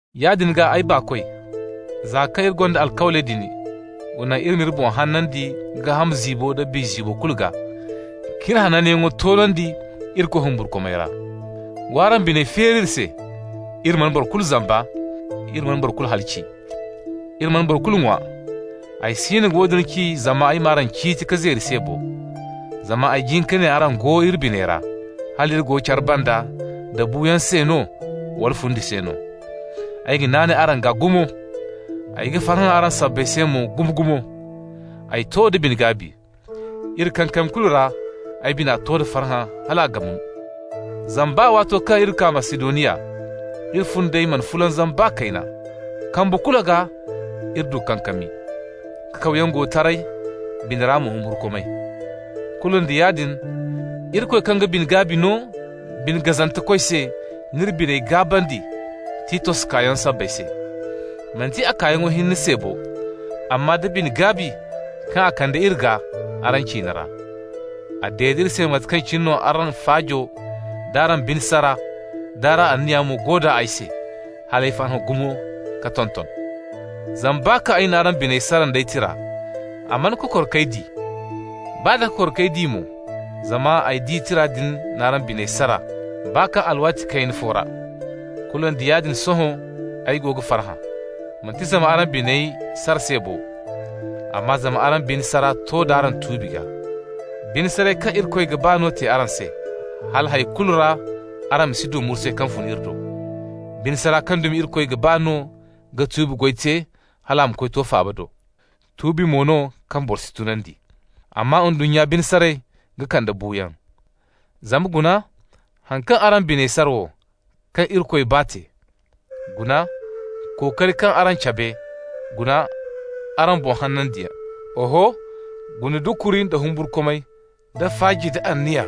Yaadin gaa, ay baakoy, za kaŋ iri gonda alkawley din, wa naŋ iri m'iri boŋ hanandi gaaham ziibo nda biya ziibo kulu gaa, k'iri hananyaŋo toonandi Irikoy humburkumay ra. W'araŋ biney feeri iri se. Iri mana boro kulu zamba, iri mana boro kulu halaci, iri mana boro kulu ŋwa. Ay siino ga woodin ci zama ay m'araŋ ciiti ka zeeri se bo, zama ay jin ka ne araŋ go iri biney ra, hal iri go care banda, da buuyaŋ se no wala fundi se no. Ay ga naanay araŋ gaa gumo, ay ga farhã araŋ sabbay se mo gumo-gumo. Ay to da bine-gaabi. Iri kankami kulu ra ay bina to da farhã hal a ga mun. Zama baa waato kaŋ iri kaa Masidoniya, iri fundey mana fulanzam baa kayna. Kambu kulu gaa iri du kankami. Kakawyaŋ go taray, bina ra mo humburkumay. Kulu nda yaadin, Irikoy kaŋ ga bine-gaabi no bine gazantekoy se n'iri biney gaabandi Titos kaayaŋo sabbay se. Manti a kaayaŋo hinne se bo, amma da bine-gaabi kaŋ a kande iri gaa araŋ ciine ra. A dede iri se mate kaŋ cine araŋ faajo, d'araŋ bine sara, d'araŋ anniya mo go d'a ay se, hal ay farhã gumo ka tonton. Zama baa kaŋ ay n'araŋ biney sara nd'ay tira, a mana kokor k'ay di. Baa d'a kokor k'ay di mo (zama ay di tira din n'araŋ biney sara baa kaŋ alwaati kayna fo ra), kulu nda yaadin sohõ ay go ga farhã. Manti zama araŋ biney sara se bo, amma zama araŋ bine sara to d'araŋ tuubi gaa. Bine saray kaŋ Irikoy ga ba no te araŋ se, hala hay kulu ra araŋ ma si du mursay kaŋ fun iri do. Bine sara kaŋ dumi Irikoy ga ba no ga tuubi goy te hal a ma koy to faaba do. Tuubi mo no kaŋ boro si tunandi. Amma ndunnya bine saray ga kande buuyaŋ. Zama guna haŋ kaŋ araŋ biney sara wo, kaŋ Irikoy ba, te: guna kookari kaŋ araŋ cabe, guna araŋ boŋ hanandiyaŋ! Oho, guna dukuri, da humburkumay, da faaji, da anniya,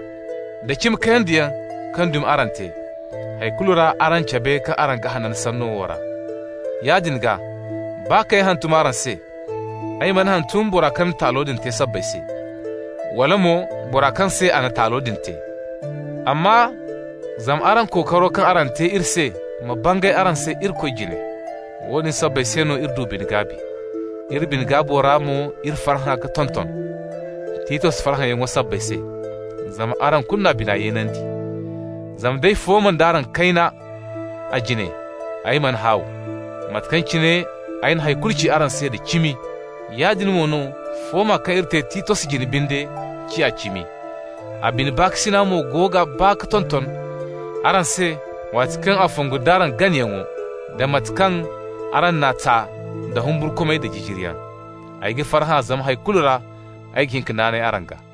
da cimi-kayandiyaŋ kaŋ yaŋ dumi araŋ te! Hay kulu ra araŋ cabe kaŋ araŋ ga hanan sanno wo ra. Yaadin gaa, baa kaŋ ay hantum araŋ se, ay mana hantum bora kaŋ na taalo din te sabbay se, wala mo bora kaŋ se a na taalo din te, amma zama araŋ kookaro kaŋ araŋ te iri se ma bangay araŋ se Irikoy jine. Woodin sabbay se no iri du bine-gaabi. Iri bine-gaabo ra mo iri farhã ka tonton Titos farhãyaŋo sabbay se, zama araŋ kulu n'a bina yeenandi. Zama d'ay fooma d'araŋ kayna a jine, ay mana haaw. Mate kaŋ cine ay na hay kulu ci araŋ se da cimi, yaadin mo no fooma kaŋ iri te Titos jine binde ciya cimi. A bine baakasina mo go ga baa ka tonton araŋ se waati kaŋ a ga fongu d'araŋ ganayaŋo, da mate kaŋ araŋ n'a ta nda humburkumay da jijiriyaŋ. Ay ga farhã zama hay kulu ra ay ga hin ka naanay araŋ gaa.